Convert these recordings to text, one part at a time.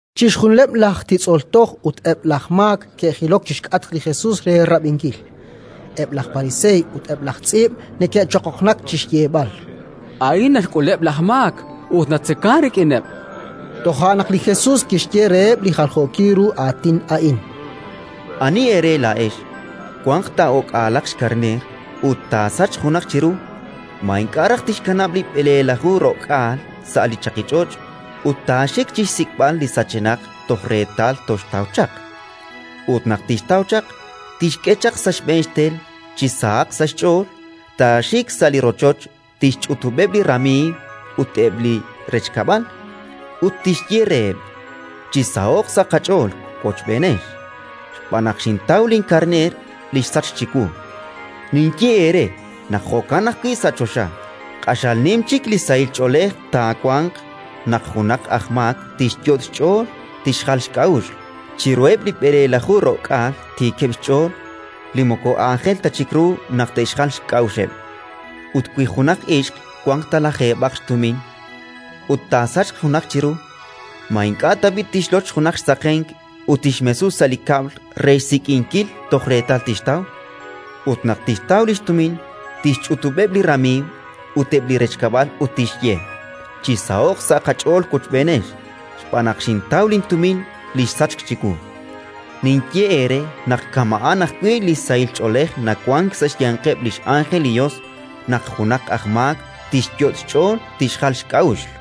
Chixjunileb' laj titz'ol toj ut eb' laj maak ke'jilok chi xk'atq li Jesus re rab'inkil. Eb' laj pariseey ut eb' laj tz'iib' neke'choqoqnak chi xyeeb'al: —A'in naxk'uleb' laj maak ut natzekank rik'ineb', chankeb'. Toja' naq li Jesus kixye reheb' li jaljookil ru aatin a'in: “Ani eere laa'ex, wanq ta o'k'aalaq xkarneer ut taasachq junaq chiru, ma ink'a' raj tixkanab' li b'eleelaju ro'k'aal sa' li chaqich'och' ut taaxik chi xsik'b'al li sachenaq toj reetal toxtaw chaq? Ut naq tixtaw chaq, tixk'e chaq sa' xb'een xtel chi sahaq sa' xch'ool, taaxik sa' li rochoch, tixch'utub'eb' li ramiiw ut eb' li rechkab'al, ut tixye reheb': «Chisaho'q sa' qach'ool wochb'eenex, xb'aan naq xintaw linkarneer li xsachk chiwu». “Ninye eere naq jo'kan ajwi' sa' choxa. Q'axal nim chik li sahil ch'oolej taawanq naq junaq aj maak tixyot' xch'ool tixjal xk'a'uxl, chiruheb' li b'eleelaju ro'k'aal tiikeb' xch'ool li moko aajel ta chik ru naq te'xjal xk'a'uxeb'. “Ut wi junaq ixq wanq ta lajeeb'aq xtumin ut taasachq junaq chiru, ma ink'a' tab'i' tixloch junaq xsaqenk ut tixmesu sa' li kab'l re xsik'inkil toj reetal tixtaw? Ut naq tixtaw li xtumin, tixch'utub'eb' li ramiiw ut eb' li rechkab'al ut tixye: «Chisaho'q sa' qach'ool wochb'eenex, xb'aan naq xintaw lintumin li xsachk chiwu». “Ninye eere naq kama'an ajwi' li sahil ch'oolej nawank sa' xyanqeb' li x'ánjel li Yos naq junaq aj maak tixyot' xch'ool tixjal xk'a'uxl”.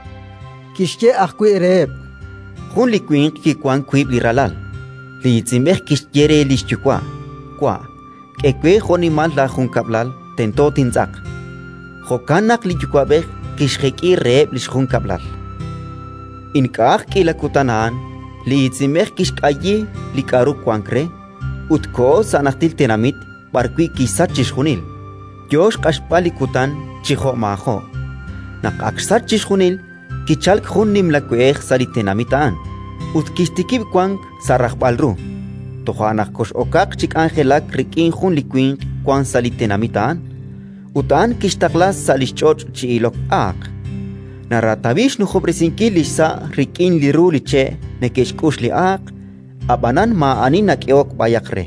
Kixye ajwi' reheb': “Jun li winq kiwank wiib' li ralal. Li iitz'inb'ej kixye re li xyuwa': «Wa', k'e we jo'nimal laajunkab'lal tento tintz'aq». Jo'kan naq li yuwa'b'ej kixjek'i reheb' li xjunkab'lal. Ink'a'aq k'iila kutan a'an, li iitz'inb'ej kixk'ayi li k'aru wank re ut koho sa' najtil tenamit b'arwi' kixsach chixjunil, yo xq'axb'al li kutan chi jo'maajo'. “Naq ak xsach chixjunil, kichalk jun nimla we'ej sa' li tenamit a'an, ut kixtikib' wank sa' rajb'al ru. Toja' naq kox'okaq chi k'anjelak rik'in jun li winq wank sa' li tenamit a'an; ut a'an kixtaqla sa' li xch'och' chi ilok aaq. Naratawi xnujob'resinkil li xsa' rik'in li ru li che' neke'xk'ux li aaq, ab'anan maa'ani nak'ehok b'ayaq re.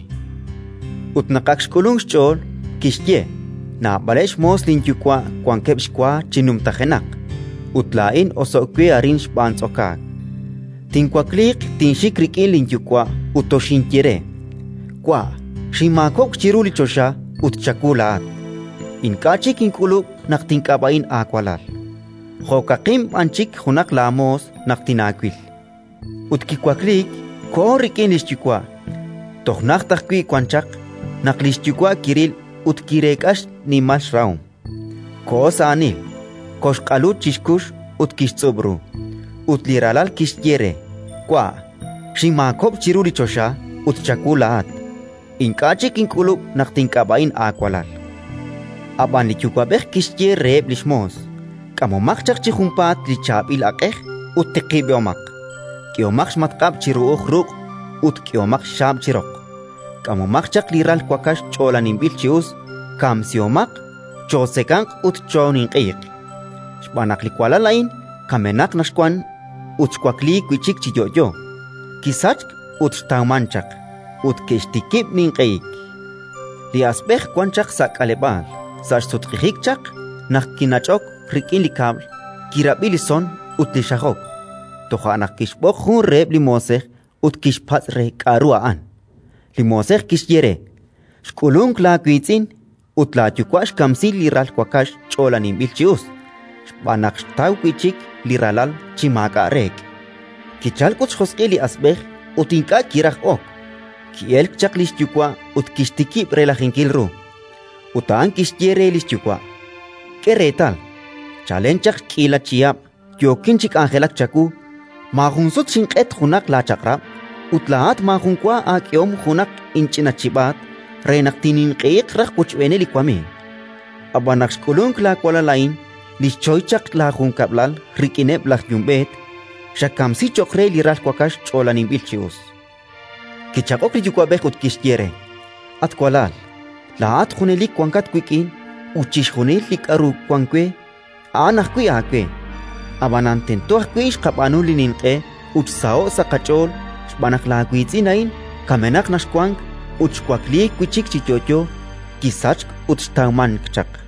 “Ut naq ak xk'ulunk xch'ool, kixye: «Naab'aleb' xmoos linyuwa' wankeb' xwa chi numtajenaq, ut laa'in oso'k we arin xb'aan tz'okaak! Tinwakliiq, tinxik rik'in linyuwa' ut toxinye re: Wa', xinmaakob'k chiru li choxa ut chawu laa'at. Ink'a' chik ink'ulub' naq tink'ab'a'in aawalal; jo'kaqin b'an chik junaq laamoos naq tinaawil». Ut kiwakliik, koho rik'in li xyuwa'. “Toj najt ajwi' wan chaq, naq li xyuwa' kiril ut kireek'a xnimal xrahom: koho sa' aanil, koxq'alu chi xkux ut kixtz'ub' ru. Ut li ralal kixye re: «Wa', xinmaakob'k chiru li choxa ut chawu laa'at. Ink'a' chik ink'ulub' naq tink'ab'a'in aawalal». “Ab'an li yuwa'b'ej kixye reheb' li xmoos: «K'amomaq chaq chi junpaat li chaab'il aq'ej ut tiqib'omaq. K'ehomaq xmatq'ab' chi ru'uj ruq' ut k'ehomaq xxaab' chi roq. K'amomaq chaq li ral wakax ch'oolaninb'il chi us, kamsihomaq, chootzekanq ut chooninq'ehiq! Xb'aan naq li walal a'in kamenaq naq xwank ut xwakliik wi' chik chi yo'yo, kisachk ut xtawmank chaq!». Ut ke'xtikib' ninq'ehik. “Li asb'ej wan chaq sa' k'aleb'aal. Sa' xsutq'ijik chaq, naq kinach'ok rik'in li kab'l, kirab'i li son ut li xajok. Toja' naq kixb'oq jun reheb' li moosej ut kixpatz' re k'aru a'an. Li moosej kixye re: «Xk'ulunk laawiitz'in ut laayuwa' xkamsi li ral wakax ch'oolaninb'il chi us, xb'aan naq xtaw wi' chik li ralal chi maak'a' reek'». “Kichalk ut xjosq'il li asb'ej ut ink'a' kiraj ok. Ki'elk chaq li xyuwa' ut kixtikib' relajinkil ru. Ut a'an kixye re li xyuwa': «K'e reetal. Chalen chaq k'iila chihab' yookin chi k'anjelak chawu. Maajun sut xinq'et junaq laachaq'rab', ut laa'at maajun wa aak'ehom junaq inch'ina chib'aat re naq tinninq'ehiq raj wochb'eeneb' li wamiiw. Ab'an naq xk'ulunk laawalal a'in li xchoy chaq laajunkab'lal rik'ineb' laj yumb'eet, xakamsi cho'q re li ral wakax ch'oolaninb'il chi us». “Kichaq'ok li yuwa'b'ej ut kixye re: «At walal, laa'at junelik wankat wik'in ut chixjunil li k'aru wank we, a'an ajwi' aawe. Ab'anan tento ajwi' xqab'aanu li ninq'e ut xsaho'k sa' qach'ool, xb'aan naq laawiitz'in a'in kamenaq naq xwank ut xwakliik wi' chik chi yo'yo, kisachk ut xtawmank chaq»”.